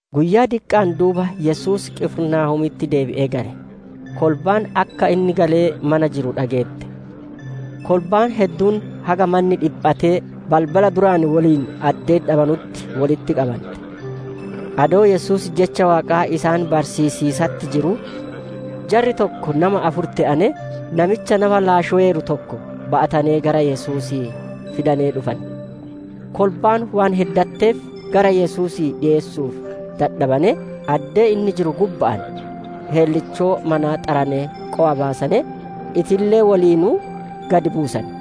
Guyyaa diqqa'aan duuba Yesuus Qifirnaahoomitti deebi'ee gale; kolbaan akka inni galee mana jiru dhageette. Kolbaan hedduun haga manni dhiphatee, balbala duraan woliin addee dhabanutti wolitti qabante. Adoo Yesuus jecha Waaqaa isaan barsiisiisatti jiruu, jarri takka nama afur te'anee, namicha nafa laashoweeru tokko ba'atanee gara Yesuusii fidanee dhufane. Kolbaan waan heddatteef gara Yesuusii dhiyeessuu dadhabanee, addee inni jiru gubba'aan heellichoo manaa xaranee qowa baasanee, itillee woliinuu gad buusane.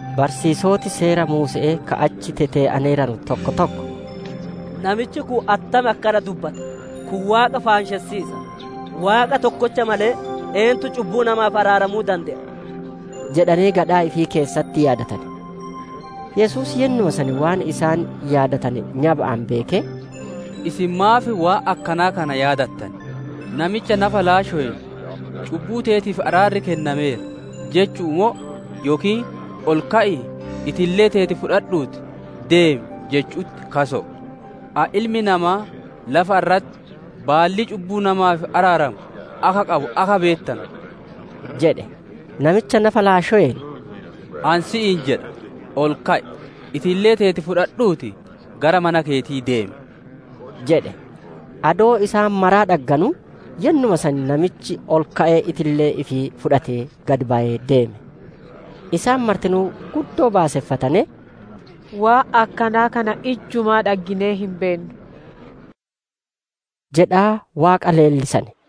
Barsiisoti Seera Muuse'ee ka achi tetee'aneeranu tokko tokko, «Namichi kun attam akkana dubbata? Kun Waaqa faanshessiisa! Waaqa tokkocha malee eennutti cubbuu namaaf araaramuu dande'a?» jedhanee gadhaa ifii keessatti yaadatane. Yesuus yennuma san waan isaan yaadatane nyaba'aan beekee, «Isin maaf waan akkanaa kana yaadattan? Namicha nafa laashoween, ‹Cubbuu teetiif araarri kennameera› jechu'u moo yookiin, ‹Ol ka'ii, itillee teeti fudhadhuutii deemi› jechu'utti kaso'o? Ani Ilmi namaa lafa irratti baallii cubbuu namaaf araaramu akka qabu akka beettanu» jedhee, namicha nafa laashoween, «Ani si'iin jedha, ol ka'i! Itillee teeti fudhadhuutii gara mana keetii deemi» jedhe. Adoo isaan maraa dhagganuu, yennuma san namichi ol ka'ee itillee ifii fudhatee gad bayee deeme. Isaan martinuu guddoo baaseffatanee, «Waan akkanaa kana ijjumaa dhagginee hin beennu» jedhaa Waaqa leellisane.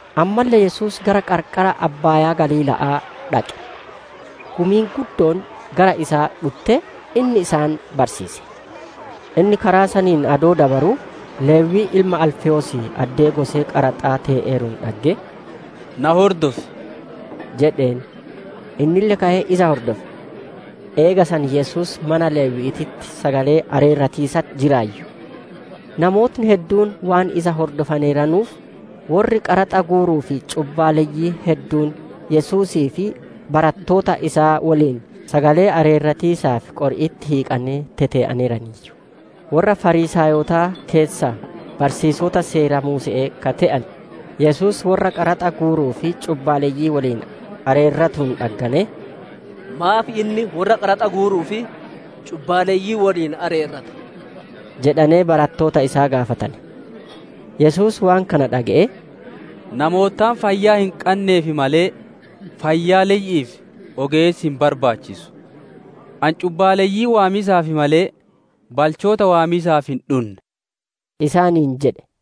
Ammalle Yesuus gara qarqara abbaayaa Galiila'aa dhaqe. Gumiin guddoon gara isaa dhuttee, inni isaan barsiise. Inni karaa saniin adoo dabaruu, Lewwii ilma Alfewoosii addee gosee qaraxaa tee'eeruun dhaggee, «Na hordofi» jedheen. Innille ka'ee isa hordofe. Eega san Yesuus mana Lewwi'iititti sagalee areerratiisatti jiraayyu. Namooti hedduun waan isa hordofaneeranuuf, worri qaraxa guuruu fi cubbaaleyyiin hedduun Yesuusii fi barattoota isaa woliin sagalee areerratiisaaf qori'itti hiiqanee tetee'aneeraniiyyu. Worra Fariisaayota keessaa barsiisota Seera Muuse'ee ka te'ane, Yesuus worra qaraxa guuruu fi cubbaaleyyii woliin areerratuun dhagganee, «Maaf inni worra qaraxa guuruu fi cubbaaleyyii woliin areerrata?» jedhanee barattoota isaa gaafatane. Yesuus waan kana dhage'ee, «Namoottaan fayyaa hin qanneef malee, fayyaaleyyi'iif ogeessi hin barbaachisu. Ani cubbaaleyyii waamiisaaf malee, balchoota waamiisaaf hin dhunne» isaaniin jedhe.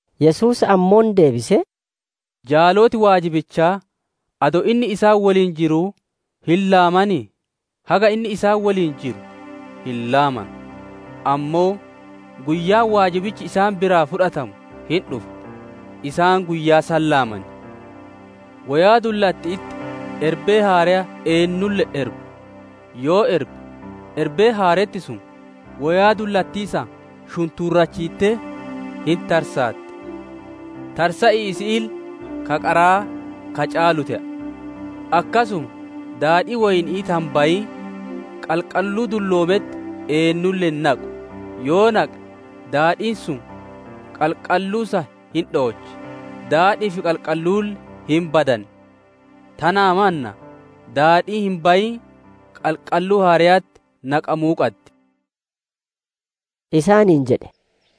Yesuus ammoo deebisee, «Jaaloti waajibaa, adoo inni isaan woliin jiruu hin laamanii? Haga inni isaan woliin jiru hin laamanu. Ammoo guyyaan waajibichi isaan biraa fudhatamu hin dhufa; isaan guyyaa san laaman. «Woyaa dullatti'itti erbee haareya eennulle hin erbu; yoo erbe, erbeen haaretti sun woyaa dullattii san shuntuurachiittee hin tarsaatti; tarsa'iisi isi'iille ka qaraa ka caalu te'a. Akkasuma daadhii Woyni'ii ta hin bayin qalqalluu dulloometti eennulle hin naqu; yoo naqe daadhiin sun qalqalluu san hin dhoochi; daadhi'ii fi qalqalluulle hin badan. Tanaa mannaa daadhiin hin bayin qalqalluu haareyatti naqamuu qaddi» isaaniin jedhe.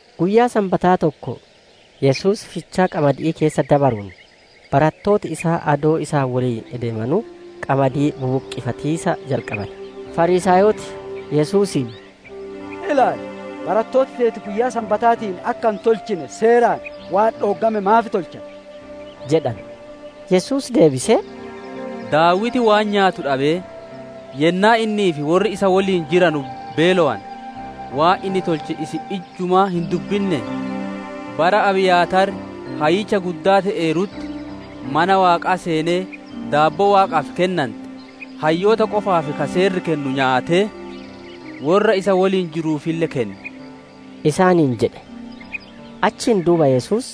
Guyyaa Sanbataa tokko Yesuus fichaa qamadi'ii keessa dabaruun, barattooti isaa adoo isa woliin ideemanuu qamadii bubuqqifatiisa jalqabane. Fariisaayoti Yesuusiin «Ilaali, barattooti teeti guyyaa Sanbataatiin akka hin tolchine Seeraan waan dhooggame maaf tolchan?» jedhane. Yesuus deebisee, «Daawiti waan nyaatu dhabee, yennaa innii fi worri isaa woliin jiranu beelowane, waan inni tolche isin ijjumaa hin dubbinnee? Bara Abiyaataar Hayyicha Guddaa te'eerutti, mana Waaqaa seenee daabboo Waaqa dura dhikaattu, hayyoota qofaaf ka Seerri kennu nyaatee, worra isa woliin jiranuufille kenne» isaaniin jedhe. Achiin duuba Yesuus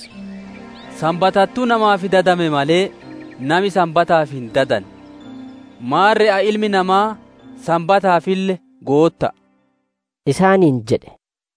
«Sanbatattuu namaaf dadame malee, nami Sanbataaf hin dadanne. Maarre Ani Ilmi Namaa Sanbataafille Gootta'a» isaaniin jedhe.